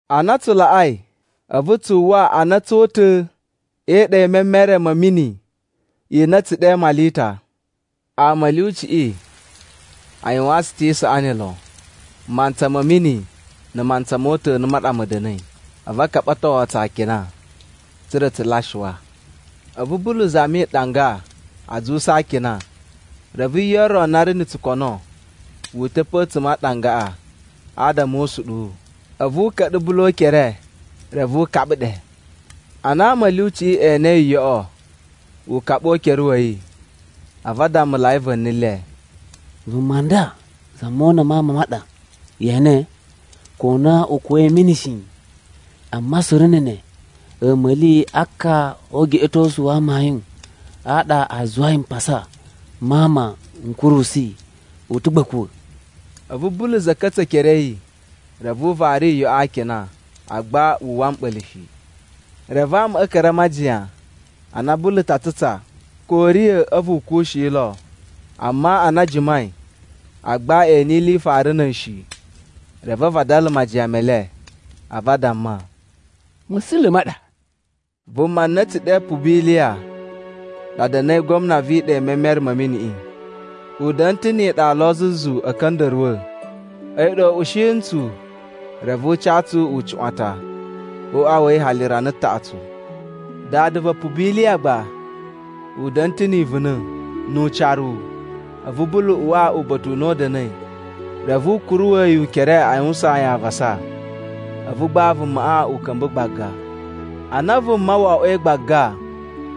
Ana tsu laꞌai, a̱vu tsu uwwa a na tsu ta̱ e iɗa i memere ma̱ mini i na a̱ tsu ɗe Malita. Ama a̱ lyuciꞌi a yuwaan tsu ta̱ isaꞌani lon. Mantsa ma̱ mini na̱ mantsa mo uta̱nu ma ɗa ma̱ da̱na̱i, a̱vu a kaɓatowo tsu akina, tsa̱ra̱ tsu lyasuwa. A̱vu Bulu zami ɗanga a zuwusa a akina, reve yo ro na ri na̱ tsukono wu uta̱ pe a̱tsuma̱ a ɗangaꞌa adama o usuɗuwu, a̱vu u ka̱ɗa̱ Bulu o ukere reve u kaɓa ɗe. Ana ama a̱ lyuciꞌi e enei yoꞌo ukaɓu o ukere wa̱ yi, a̱vu a dammulai va̱ni le, “Vuma nda za mona ma ama ma ɗa! Ye ene, ko na u kuwa̱i a̱ mini shi, amma suru na̱ ne a̱a̱ma̱li a ka o ugeꞌetosu wa amayun a ɗa a zuwai mpasa ma ama n kurusu yi, u ta̱ gba a̱ kuwa̱.” A̱vu Bulu za̱ka̱tsa̱ ekere a̱ yi reve u vari yoꞌo a akina, agba wu uwwa mɓa̱la̱ shi. Reve amaꞌa a̱ ka̱ra̱ a majiyan a na Bulu ta tsutsa ko u riya̱ a̱vu u kuwushi lo. Amma ana a jimai, agba e ene ili i fara na̱ a̱yi shi. Reve a vadala majiyan me le, a̱vu a damma, “Ma̱sula̱ ma ɗa.” Vuma na a̱ tsu ɗe Pubiliya ɗa da̱na̱i gwamna vi iɗa i memere ma̱ miniꞌi. U da̱na̱ ta̱ ni iɗa lo zuzu a̱ ka̱nda̱ruwa̱. A̱yi ɗa u ushi ntsu, reve u ca tsu ucuꞌwatan o uꞌwa wa̱ yi hali rana taꞌatsu. Dada va Pubiliya gba u da̱na̱ ta̱ ni ivuna̱ nu ucaruwu. A̱vu Bulu uwa uba̱ta̱ u na u da̱na̱i. Reve u kuruwa̱ yi ukere a yuwusaan yi avasa, a̱vu gba vumaꞌa u ka̱mba̱ gbaga. Ana vuma wo oꞌwoi gbaga,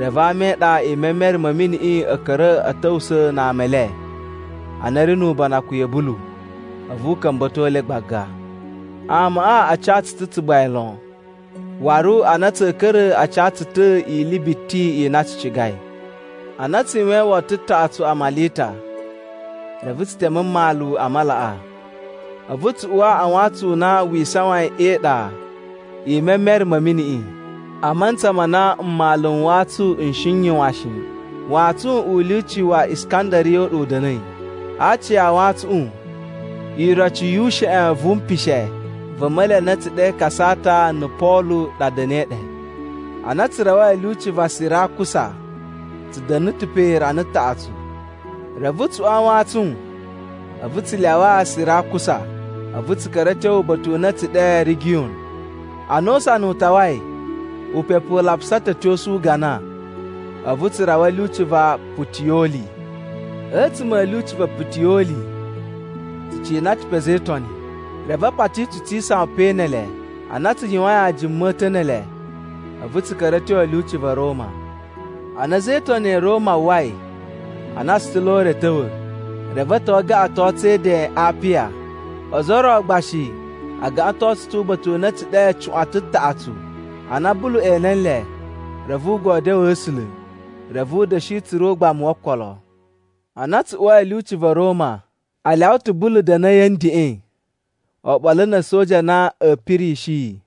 reve ama e iɗa i memere ma̱ miniꞌi a̱ ka̱ra̱ a̱ ta̱wusa̱a̱ na ama e le a na a̱ ri nu ubanakun ya̱ Bulu a̱vu u ka̱mba̱to le gbaga. Amaꞌa a ca tsu ta̱ tsugbain lon, waru ana tsa̱a̱ ka̱ra̱ a ca tsu ta̱ ili biti i na tsu cigai. Ana tsu yuwain woto taꞌatsu a Malita, reve tsu teme mmalu a malaꞌa. A̱vu tsu uwa a wantsun u na wi isawain e iɗa i memere ma̱ miniꞌi a mantsa ma na mmalu a wantsun n shi n yuwan shi. Wantsun u lyuci wa Iskandariya u ɗa u da̱na̱i. A aaci a wantsuꞌun, iroci yu usheꞌen vu mpishe va̱ a̱ma̱li a na a̱ tsu ɗe Kasata na̱ Polu ɗa da̱na̱i ɗe. Ana tsu rawai a̱ lyuci va Sirakusa, tsu da̱nu ta̱ pe rana taꞌatsu. Reve tsu uwa a wantsun a̱vu tsu lyawa Sirakusa, a̱vu tsu ka̱ra̱ a̱ tyo uba̱ta̱ u na a̱ tsu ɗe Rigiyun. Ana usana u tawai, upepu u lapusa ta̱ a̱ tyosu ugana, a̱vu tsu rawa a̱ lyuci va Putiyoli. A̱tsuma̱ a̱ lyuci va Putiyoli tsu cina ta̱ pe a̱za̱ e Itoni, reve a pati tsu tsi isawan pe ne ele. Ana tsu yuwain ajuma a̱ ta̱ ne ele, a̱vu tsu ka̱ra̱ a̱ tyo a̱ lyuci va̱ Roma. Ana a̱za̱ e Itoni ya̱ Roma a uwwai a na tsu ta̱ lo o ure a̱ ta̱wa̱, reve a̱ ta̱wa̱ a gaꞌaton tsu e Eden a Apiya. Ozo o ro gba shi a gaꞌaton tsu ta̱ uba̱ta̱ u na a̱ tsu ɗe Cuꞌwatan Taꞌatsu. Ana Bulu ene nle, reve u godyoo A̱sula̱ reve u da̱shi tsura̱ ugbamu wo okolo. Ana tsu uwai a̱ lyuci va̱ Roma, a lyawa ta̱ Bulu da̱na̱ a̱yi a̱ ndeꞌen oɓolo na̱ a̱soja a na a̱ pirishi yi.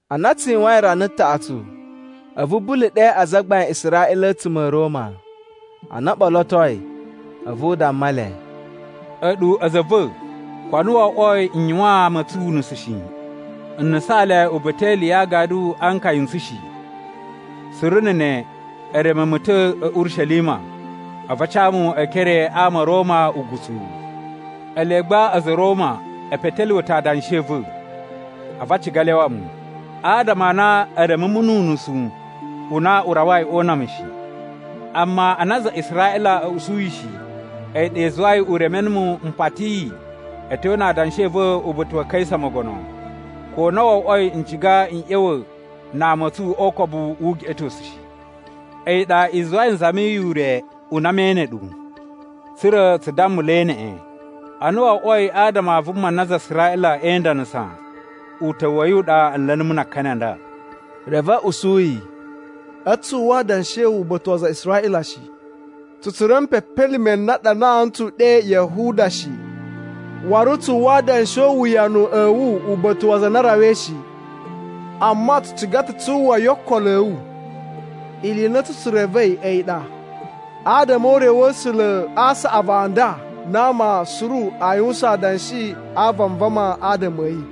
Ana tsu yuwain rana taꞌatsu, a̱vu Bulu ɗe azagbain a Israꞌila a̱tsuma̱ a̱ Roma. Ana o ɓolotoi a̱vu u damma le, “A̱ɗu a̱za̱ a̱ va̱, ko na wo oꞌwoi n yuwaan ama a̱ tsu unusu shi, n nusaan le uba̱ta̱ e ili ya agadu a nkaya n tsu shi. Suru na̱ ne e reme mu ta̱ a̱ Urishelima, a̱vu a ca mu e ekere a ama a̱ Roma ugutsuwu. Ele gba a̱za̱ a̱ Roma e petelyuwe ta̱ adanshi a̱ va̱, a̱vu a ciga a lyawa mu, adama a na e reme mu nu unusu u na u rawai o una mu shi. Amma ana aza a Israꞌila a̱ usu yi shi, a̱yi ɗa i zuwai u reme numu m patiyi a̱ tyo na adanshi a̱ va̱ uba̱ta̱ wa Kaisa mogono, ko na wo oꞌwoi n ciga n ꞌya̱wa̱ na ama a̱ tsu o ukobu wu ugeꞌetosu shi. A̱yi ɗa i zuwai n zamiyi ure u na me ene ɗu, tsa̱ra̱ tsu dammulai neꞌen, ana wo oꞌwoi adama a vuma na aza a Israꞌila e indanasa uta̱wu wa̱ yi u ɗa a̱ nla̱ numu na akani a nda.” Reve a̱ usu yi, “A̱tsu tsu uwwa adanshi a̱ wu uba̱ta̱ wa aza a Israꞌila shi. Tsu tsura̱ mpepelime n na a ɗanaa ntsu ɗe Yahuda shi. Waru tsu uwwa adanshi o uwuyanu a̱ wu uba̱ta̱ wa aza a na a rawai shi. Amma tsu ciga ta̱ tsu uwwa yo okolo a̱ wu. Ili i na a̱tsu tsu revei a̱yi ɗa, adama o ure wa̱ A̱sula̱ a saꞌavu a nda na ama suru a yuwusan adanshi a vanvama adama a̱ yi.”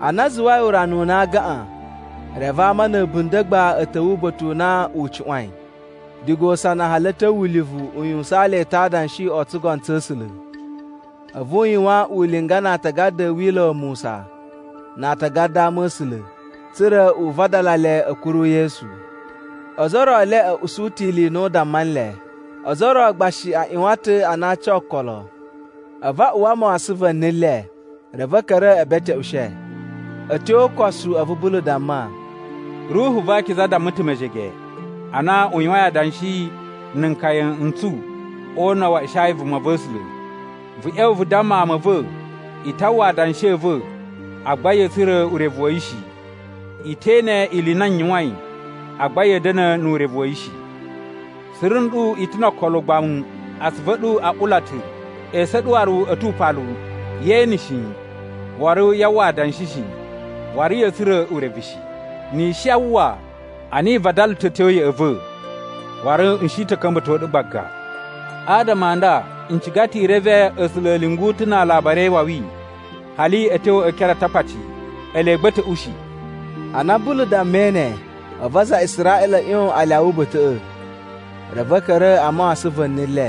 Ana a zuwai urana u na a gaꞌan, reve ama na̱ a̱bunda̱ gba a̱ ta̱wa̱ uba̱ta̱ u na u cuꞌwain. Diga usana hali a̱ tyo ulivu u yuwusaan le ta̱ adanshi o tsugono tsa̱ A̱sula̱. A̱vu u yuwan ulinga na atagada a̱ Wila̱ wa Musa na atagada a Ama̱sula̱, tsa̱ra̱ u vadala le a̱ kuru Yesu. Ozo o ro e le a̱ usu ta̱ ili i na u damma nle, ozo o ro gba shi a ꞌyuwan ta̱ a na a ca okolo. A̱vu a uwa mawasan va̱ni le, reve a̱ ka̱ra̱ e beteꞌushe. A̱ tyo o ukosu a̱vu Bulu damma, “Ruhu va Akiza damma ta̱ mejege, ana u yuwain adanshi na̱ nkaya n tsu o una̱ wa Ishaya vumava̱sula̱, ‘Vu ꞌya̱wa̱ vu damma ama a̱ va̱, “I ta uwwa adanshi a̱ va̱, agba ya̱a̱ tsura̱ urevu wa̱ yi shi. I te ene ili i na n yuwain, agba ya̱a̱ da̱na̱ nu urevu wa̱ yi shi. Suru nɗu i ta̱ no okolo ugbamu. Atsuvu a̱ ɗu a ula ta̱, esu a̱ ɗu waru a̱ tu upalu. Yee ene shi, waru yaa uwwa adanshi shi, waru ya̱a̱ tsura̱ urevu shi. Ni i shi a uwwa, ana i vadala ta̱ a̱ tyo ya̱ꞌa̱ va̱, waru n shi ta̱ ka̱mba̱to ɗu gbaga.” ’ “Adama a nda, n ciga ta̱ i reve A̱sula̱ a̱ lyungu ta̱ na alabari e iwawi, hali a̱ tyo e ekere a Atakpaci. Ele gba a̱ ta̱ ushi.” [ Ana Bulu dammai ne, a̱vu aza a Israꞌila a̱ ꞌyon a lyawa uba̱ta̱ꞌa̱, reve a̱ ka̱ra̱ a mawasan va̱ni le.]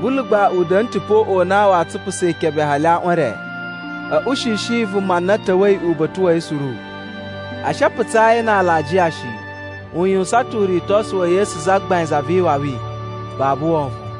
Bulu gba u da̱nu ta̱ pe o uꞌwa u na wa tsupusa ikebe hali aꞌwan e re. A̱ ushishi vuma na ta̱wa̱i uba̱ta̱ wa̱ yi suru. A̱ shi a putsaa yi na alajiya shi. U yuwusan ta̱ uritosu wa̱ Yesu Zagbain Za vi Iwawi, babu wovon.